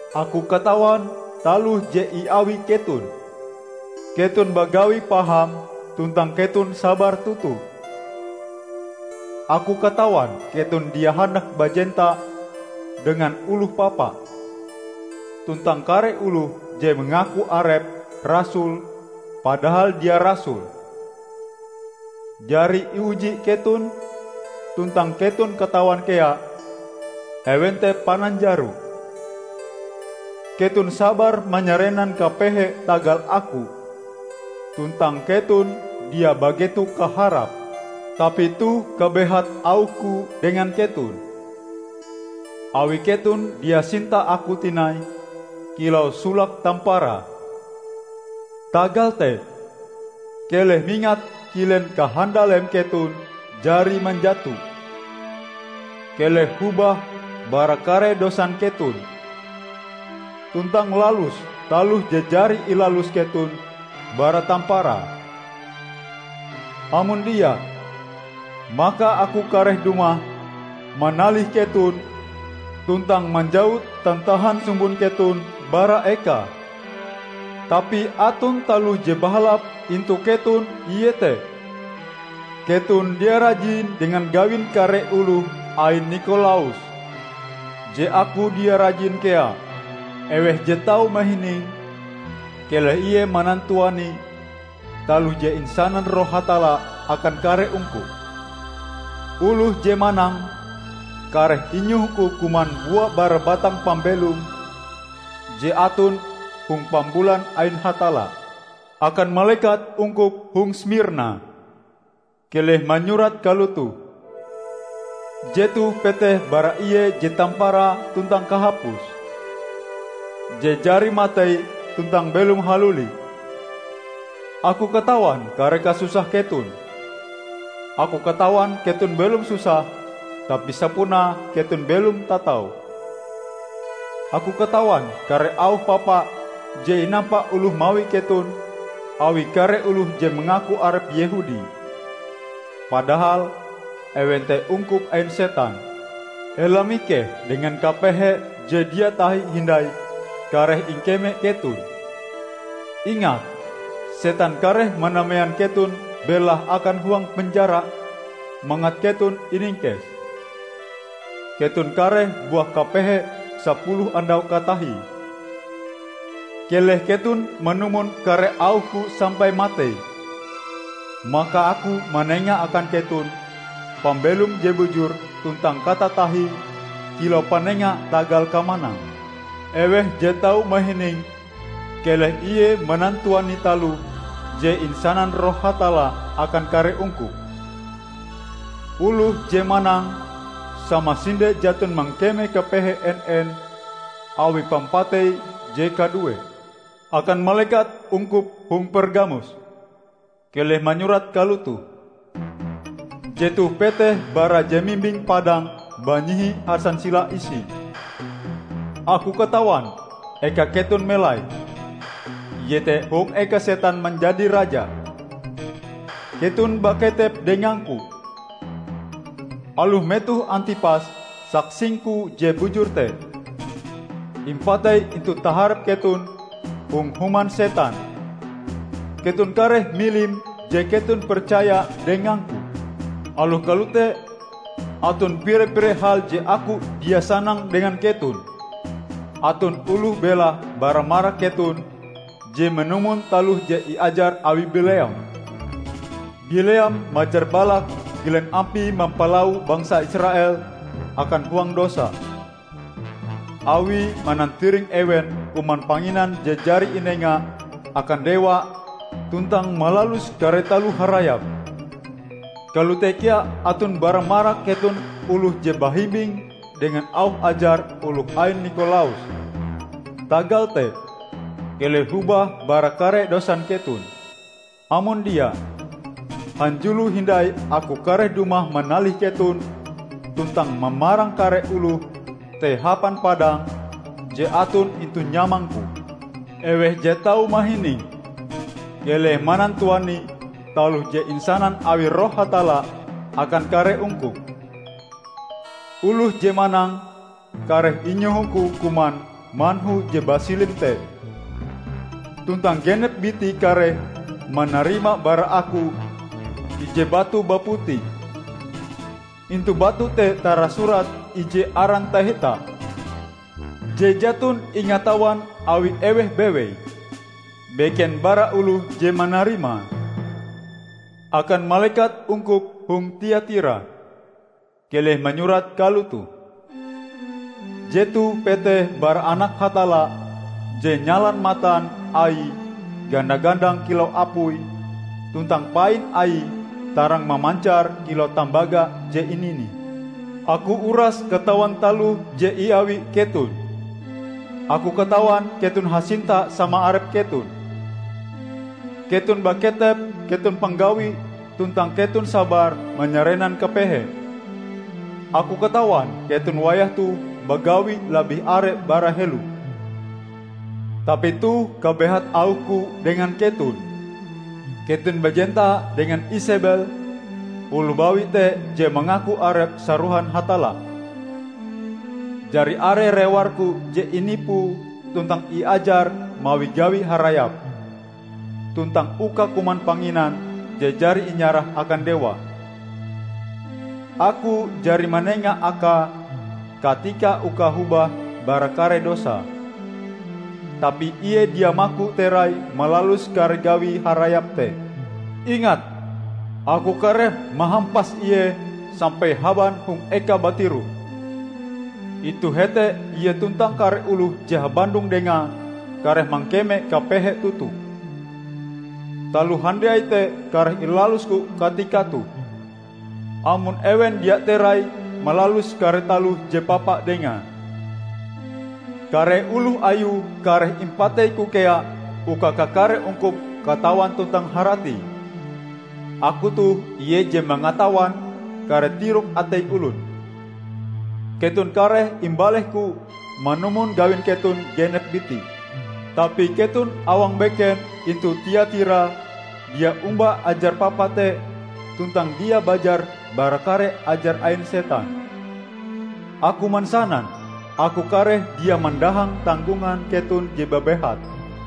Aku katawan taloh je iawi keton: Keton bagawi paham tuntang keton sabar toto. Aku katawan keton dia handak bajenta dengan oloh papa. Tuntang kare oloh je mangaku arepe rasul padahal dia rasul, jari iuji keton, tuntang keton katawan kea ewen te pananjaro. Keton sabar manyarenan kapehe tagal Aku, tuntang keton dia bageto kaharap. Tapi toh kabehat auh-Ku dengan keton: Awi keton dia sinta Aku tinai kilau solak tamparae. Tagal te, keleh mingat kilen kahandaleme keton jari manjato! Keleh hobah bara kare dosan keton, tuntang lalus taloh je jari ilalus keton bara tamparae. Amon dia, maka Aku kareh dumah, manalih keton tuntang manjawut tantahan sumbon keton bara ekae. Tapi aton taloh je bahalap intu keton, iete: Keton dia rajin dengan gawin kare oloh ain Nikolaus, je Aku dia rajin kea. Eweh je tau mahining, keleh ie manantuani taloh je insanan Roh Hatalla akan kare ungkup! Oloh je manang kareh inyohoku kuman bua bara batang pambelom je aton hong pambulan ain Hatalla." "Akan malekat ungkup hong Smirna, keleh manyurat kalotoh: Jetoh peteh bara Ie je tamparae tuntang kahapuse -- je jari matei tuntang belom haluli. Aku katawan kare kasusah keton; Aku katawan keton belom susah tapi sapunae keton belom tatau! Aku katawan kare auh papa je inampa oloh mawi keton awi kare oloh je mangaku arepe Yehudi, padahal ewen te ungkup ain setan! Ela mikeh dengan kapehe je dia tahi hindai kareh ingkeme keton. Ingat, setan kareh manamean keton belahe akan huang penjara mangat keton iningkes. Keton kareh buah kapehe sapuluh andau katahie. Keleh keton manumon kare auh-Ku sampai matei, maka Aku manenga akan keton pambelom je bujur tuntang katatahie kilau panenga tagal kamanang. Eweh je tau mahining, keleh ie manantuani taloh je insanan Roh Hatalla akan kare ungkup! Oloh je manang samasinde jaton mangkeme kapehe en-en awi pampatei je kaduee." "Akan malekat ungkup hong Pergamus, keleh manyurat kalotoh: Jetoh peteh bara je mimbing padang banyihi hansansila isie. Aku katawan eka keton melai, iete hong eka setan manjadi raja. Keton baketep dengang-Ku. Aloh metoh Antipas, saksing-Ku je bujur te, impatei intu taharep keton hong human setan, keton kareh milim je keton percaya dengang-Ku. Aloh kalote aton pire-pire hal je Aku dia sanang dengan keton: aton oloh belahe bara marak keton je manumon taloh je iajar awi Bileam. Bileam majar Balak kilen ampie mampalawo bangsa Israel akan huang dosa; awie manantiring ewen kuman panginan je jari inenga akan dewa tuntang malalus kare taloh harayap. Kalote kea aton bara marak keton oloh je bahimbing dengan auh ajar oloh ain Nikolaus. Tagal te, keleh hobah bara kare dosan keton! Amon dia, hanjulo hindai Aku kareh dumah manalih keton tuntang mamarang kare oloh te hapan padang je aton intu nyamang-Ku. Eweh je tau mahining, keleh manantuani taloh je insanan awi Roh Hatalla akan kare ungkup! Oloh je manang, kareh inyoho-Ku kuman manhu je basilim te, tuntang genep bitie kareh manarima bara Aku ije batu baputi. Intu batu te tarasurat ije aran taheta, je jaton ingatawan awi eweh bewei, beken bara oloh je manarimae." "Akan malekat ungkup hong Tiatira, keleh manyurat kalotoh: Jetoh peteh bara Anak Hatalla, je nyalan matan Aie ganda-gandang kilau apui, tuntang pain Aie tarang mamancar kilau tambaga je ininih. Aku uras katawan taloh je iawi keton -- Aku katawan keton hasinta sama arep keton, keton baketep, keton panggawi, tuntang keton sabar manyarenan kapehe. Aku katawan keton wayah toh bagawi labih are bara helo. Tapi toh kabehat auh-Ku dengan keton: Keton bajenta dengan Isebel, oloh bawi te je mangaku arepe sarohan Hatalla. Jari are rewar-Ku je inipue tuntang iajare mawi gawi harayap tuntang uka kuman panginan je jari inyarah akan dewa. Aku jari manenga akae katika uka hobah bara kare dosae, tapi ie dia maku terai malalus kare gawi harayap te. Ingat! Aku kareh mahampas ie sampai haban hong ekae batiroh. Intu hete ie tuntang kare oloh je habandong dengae kareh mangkeme kapehe toto. Taloh handiai te kareh ilalusku katika toh -- amon ewen dia terai malalus kare taloh je papa dengae. Kare oloh ayue kareh impateiku kea uka kakare ungkup katawan tuntang haratie Aku toh ie je mangatawan kare tirok atei olon. Keton kareh imbaleh-Ku manumon gawin keton genep biti. Tapi keton awang beken intu Tiatira dia omba ajar papa te tuntang dia bajar bara kare ajar ain setan. Aku mansanan Aku kareh dia mandahang tanggongan keton je babehat.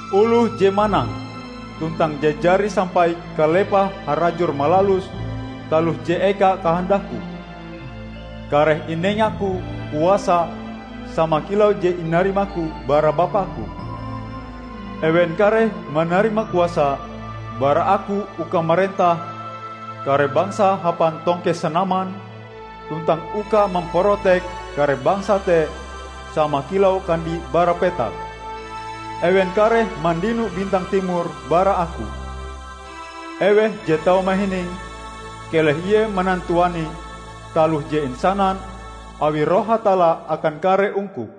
Oloh je manang, tuntang je jari sampai kalepahe harajur malalus taloh je eka kahandak-Ku, kareh inengaku kuasa sama kilau je inarima-Ku bara Bapa-Ku. Ewen kareh manarima kuasa bara Aku uka marentah kare bangsa hapan tongkeh sanaman, tuntang uka mamparotek kare bangsa te sama kilau kandi bara petak. Ewen kareh mandino bintang timor bara Aku. Eweh je tau mahining, keleh ie manantuani taloh je insanan awi Roh Hatalla akan kare ungkup!"